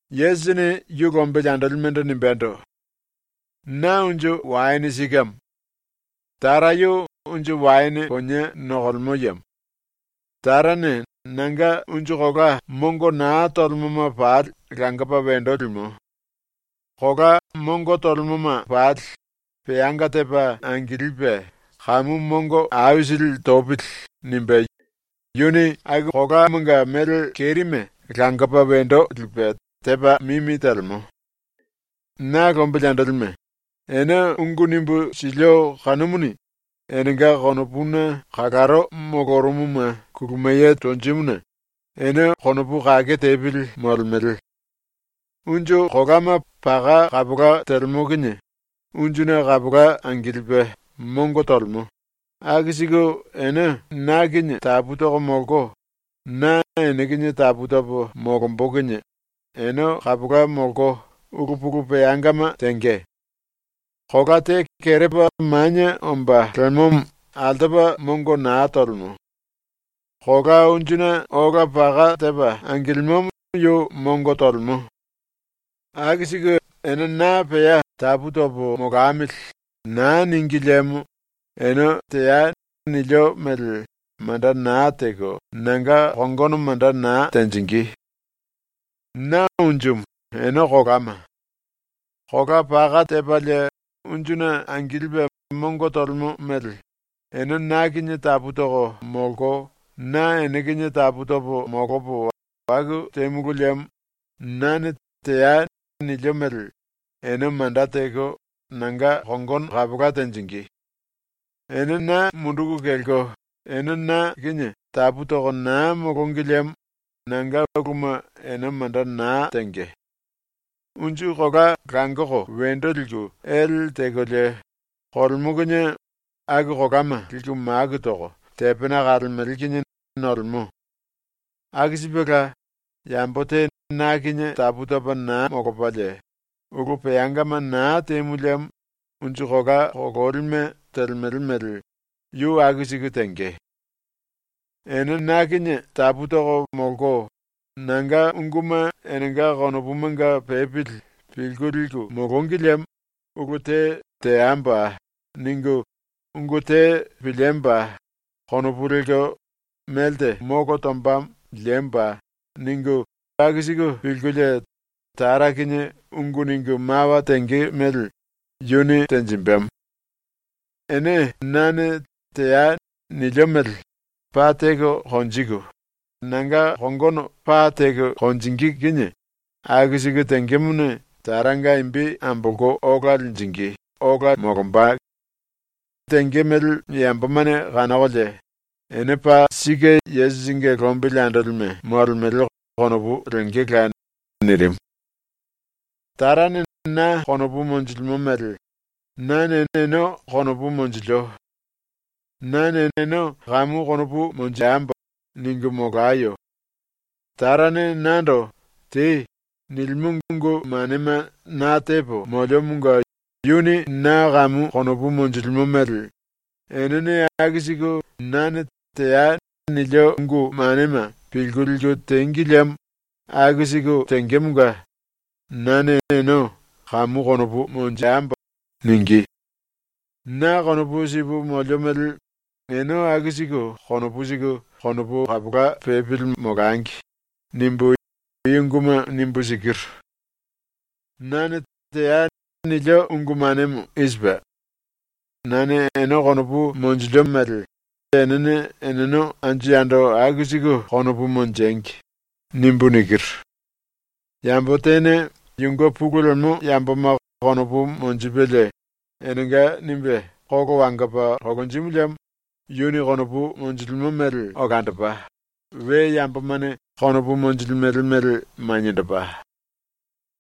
⸤Yesusini yu lombili andolimendo nimbendo:⸥ “Na unju waene sikemo. Tara yu unju waene ponie nokolemo yemo. Tarane nanga unju kola mongo naa tolemoma pali langopa wendo limo. Kola mongo tolemoma pali ‘Peanga tepa angilipe kamu mongo aisili topili.’ nimbe yuni akumanga mele kerime langopa wendo lipe tepa mimi telemo. “Na lombili andolime, ene ungu nimbu silio kanumuni ⸤enenga konopuna kalaro molorumuma kulumiye tonjimuna⸥ ene ⸤konopu⸥ kake tepili molemele. Unju kolama paka kapola telemo kinie unjuna kapola angilipe mongo tolemo, aku siku ene na kinie tapu toko molko, na ene kinie tapu topo molombo kinie ene kapola molko ulu pulu peangama tenge. Kola te kerepa manie omba lemomo altopa mongo naa tolemo. Kola unjuna ola paka tepa angilimomo yu mongo tolemo. Aku siku ene na pea ‘Tapu topo molamili.’ naa níngi liemo ene “Teai.” nilio mele manda naa teko nanga kongono manda naa tenjingí. “Na unjumu, ene kolama. Kola paka tepalie unjuna angilipe mongo tolemo mele ene na kinie tapu toko molko na ene kinie tapu topo molopo aku temulu liemo nane “Teai.” nilio mele ene manda teko nanga kongono kapola tenjingí. Ene na munduku kelko ene na kinie tapu toko naa molongi liemo nanga uluma ene manda naa tenge. Unju kola langoko wendo liku ele tekolie, kolemo kinie aku kolama liku maku toko tepena kalemele kinie nolemo. Aku sipela, yambo te na kinie tapu topa naa molopalie ulu peangama naa temu liemo unju kola kololime telemele mele yu aku siku tenge. “Ene na kinie tapu toko molko nanga unguma enenga konopumanga pepili pilku liku molongi liemo ulu te ‘Teamboa!’ ningu, ungu te ‘Piliemboa!’ konopu lelko, melte molo tombamo ‘Liemboa!’ ningu, aku siku pilkulie Tara kinie ungu ningu mawa tenge mele yuni tenjimbemo. Ene nane “Teai.” nilio mele paa teko konjiku, nanga kongono paa teko konjingí kinie aku siku tengemone Taranga imbi ambolko ola linjingí molomba kepe, ene tenge mele yambomane kanokolie ‘Ene paa sike Yesusinge lombili andolime molemele.’ konopu lengela.” ⸤nirimu.⸥ “Tarane na konopu monjilimo mele nane ene konopu monjilio. Nane ene ‘Kamu konopu monjipili.’ ningu molayo. Tarane nando “Tei.” nilimo ungu manema na tepo moliomonga yuni na kamu konopu monjilimo mele enene aku siku nane “Teai.” nilio ungu manema pilku liku tengi liemo aku siku tengemonga nane ene ‘Kamu konopu monjipili.’ ningí. ‘Na konopu sipu molio mele ene aku siku konopu siku konopu kapola pepili molangi.’ nimbu i unguma nimbu sikiru. “Nane “Teai.” nilio ungu manemo i sipe: ‘Nane ene konopu monjilio mele enene eneno anju yando aku siku konopu monjengi.’ nimbu nikiru. Yambo tene yunge pulu lemo yamboma konopu monjipelie enenga nimbe kolo wangopa kolonjimu liemo yuni konopu monjilimo mele olandopa, we yambomane konopu monjilimele mele maniendopa.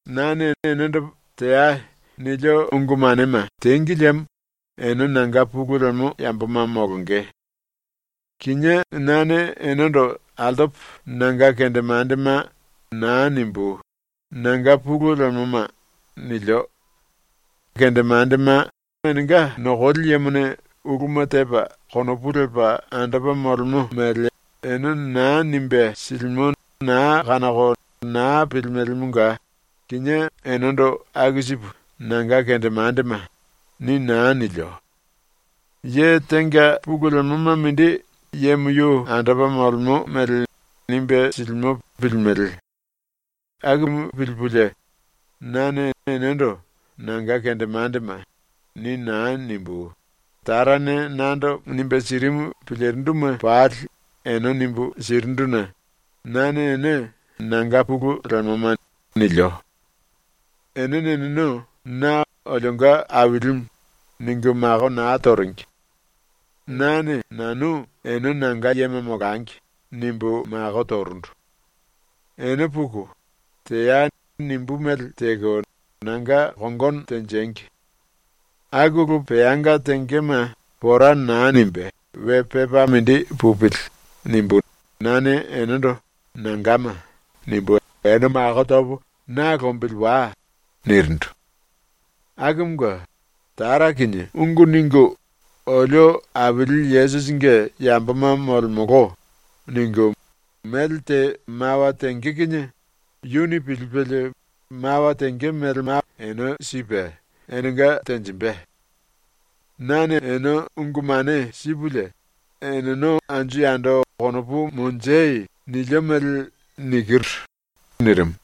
“Nane enendo “Teai.” nilio ungu manema tengi liemo ene nanga pulu lemo yamboma molonge. Kinié nane enendo altopo “Nanga kendemandema.” naa nimbu, “Nanga pulu lemoma.” nilio. Kendemandema enenga nokoli yemone uluma tepa konopu lepa andopa molemo mele ene naa nimbe silimo naa kanoko naa pilimelemonga kinié enendo aku sipu “Nanga kendemandema.” ni naa nilio. ⸤Ye tenga pulu lemoma mindi yemo yu andopa molemo mele nimbe silimo pilimele. Aku pilipulie⸥ nane enendo “Nanga kendemandema.” ni naa nimbu, Tarane nando nimbe sirimu pilirinduma pali ene nimbu sirinduna nane ene “Nanga pulu lemoma.” nilio. “Ene eneno na ‘Olionga Ailimu.’ ningu mako naa toringi. Nane nanu ene ‘Nanga yema molangi.’ nimbu mako torundu. ‘Ene puku, “Teai.” nimbú mele teko nanga kongono tenjengi. Aku ulu peanga tengema pora naa nimbe we pepa mindi pupili.’ nimbu nane enendo “Nangama.” nimbu ene mako topo “Na lombili wai.” nirindu. Akumunge Tara kinie ungu ningu “Olio Aili Yesusinge yamboma molemolo.” ningu mele te mawa tenge kinie yuni pilipelie mawa tenge melemo ene sipe enenga tenjimbe. Nane ene ungu mane sipulie “Eneno anju yando konopu monjei.” nilio mele nikiru.” nirimu.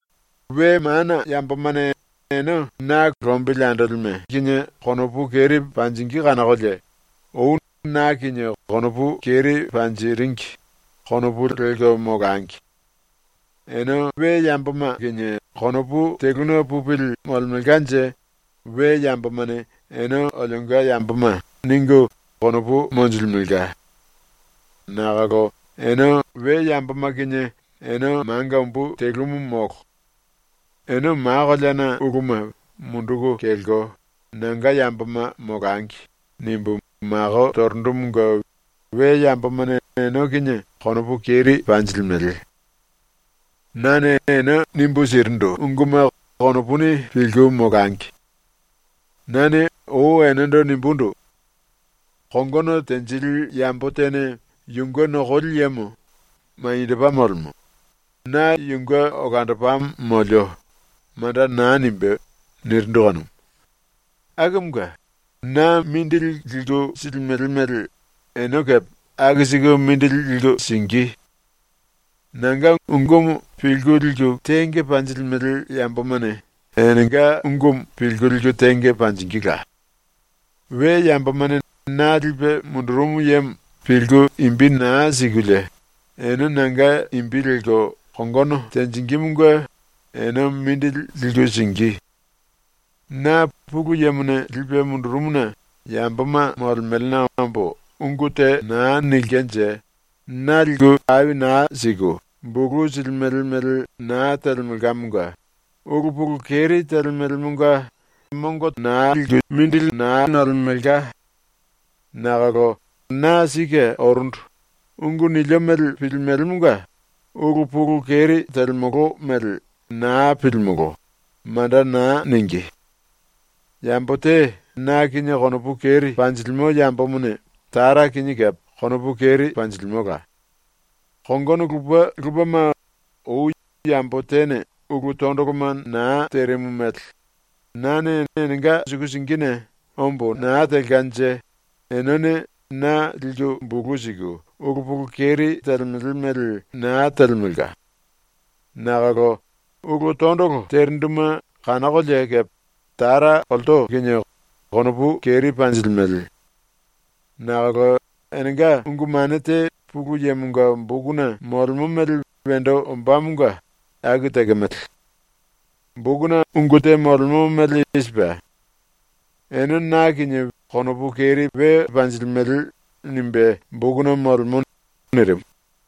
“We mana yambomane ene na lombili andolime kinie konopu keri panjingí kanokolie ‘Ou na kinie konopu keri panjiringi.’ konopu lelko molangi. Ene we yamboma kinie konopu teluna pupili molemelkanje we yambomane ‘ene olionga yamboma’ ningu konopu monjilimelka. Nakolo ene we yamboma kinie ene manga umbu telumu molo. ‘Ene ma koleana uluma munduku kelko nanga yamboma molangi.’ nimbu mako torundumunge we yambomane ene kinie konopu keri panjilimele. “Nane ene nimbu sirindu unguma konopuni pilku molangi. Nane ou enendo nimbundu: “Kongono tenjili yambo tene yunge nokoli yemo ‘Maniendopa molemo. Na yunge olandopamo molio.’ manda naa nimbé.” nirindu kanumu. Akumunge na mindili liku silimele mele ene kepe aku siku mindili liku singí. Nanga ungumu pilku liku tenge panjilimele yambomane enenga ungumu pilku liku tenge panjingíla. We yambomane na lipe mundurumu yemo pilku imbi naa sikulie, ene nanga imbi lelko kongono tenjingímunge ene mindili liku singí. Na ⸤Pulu Yemone lipe mundurumuna⸥ yamboma molemelena ombo ungu te naa nilkenje ⸤na liku ai naa siku, bulu silimele mele naa telemelkamonga⸥ ulu pulu keri telemelemonga mongo naa limelka. Nakolo ⸤na sike orundu, ungu nilio mele pilimelemonga⸥ “Ulu pulu keri telemolo mele naa pilimolo.” manda naa ningí. Yambo te na kinie konopu keri panjilimo yambomone Tara kinie kepe konopu keri panjilimola. Kongono lupe lupema, ou yambo tene ulu tondoloma naa terimu mele nane enenga suku singine ombo naa telkanje enene na liku bulu siku ulu pulu keri telemele mele naa telemelka. Nakolo ulu tondolo terinduma kanokolie kepe Tara olto kinie konopu keri panjilimele. Nakolo enenga ungu mane te Pulu Yemonga bokuna molemo mele wendo ombámonga aku tekemele. Bokuna ungu te molemo mele i sipe: “Ene na kinie we konopu keri panjilimele.” nimbe bokuna molemo.” ⸤nirimu.⸥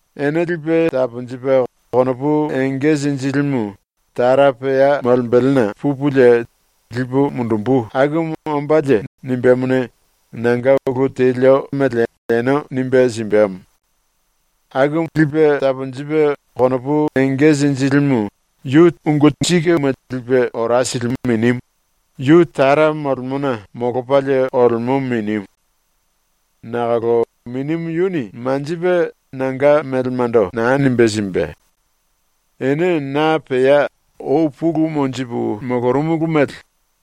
“Ene Lipe Taponjipe Konopu Enge Sinjilimu Tara pea molembelena pupulie lipu mundumbu akumu ombalie nimbemone, nanga ulu telio mele ene nimbe simbemo. I Lipe Taponjipe Konopu Enge Sinjilimu yu Sike Unguma Lipe Ora Sili Minimu, yu Tara molemona molopalie olemo Minimu. Nakolo Minimu yuni manjipe nanga melemando naa nimbe simbe. Ene na pea ou pulu monjipu molorumulu mele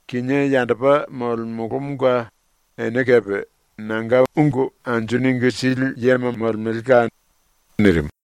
kinié yandopa molemolomonga ene kepe nanga ungu anju ningu sili yema molemelela.” ⸤nirimu.⸥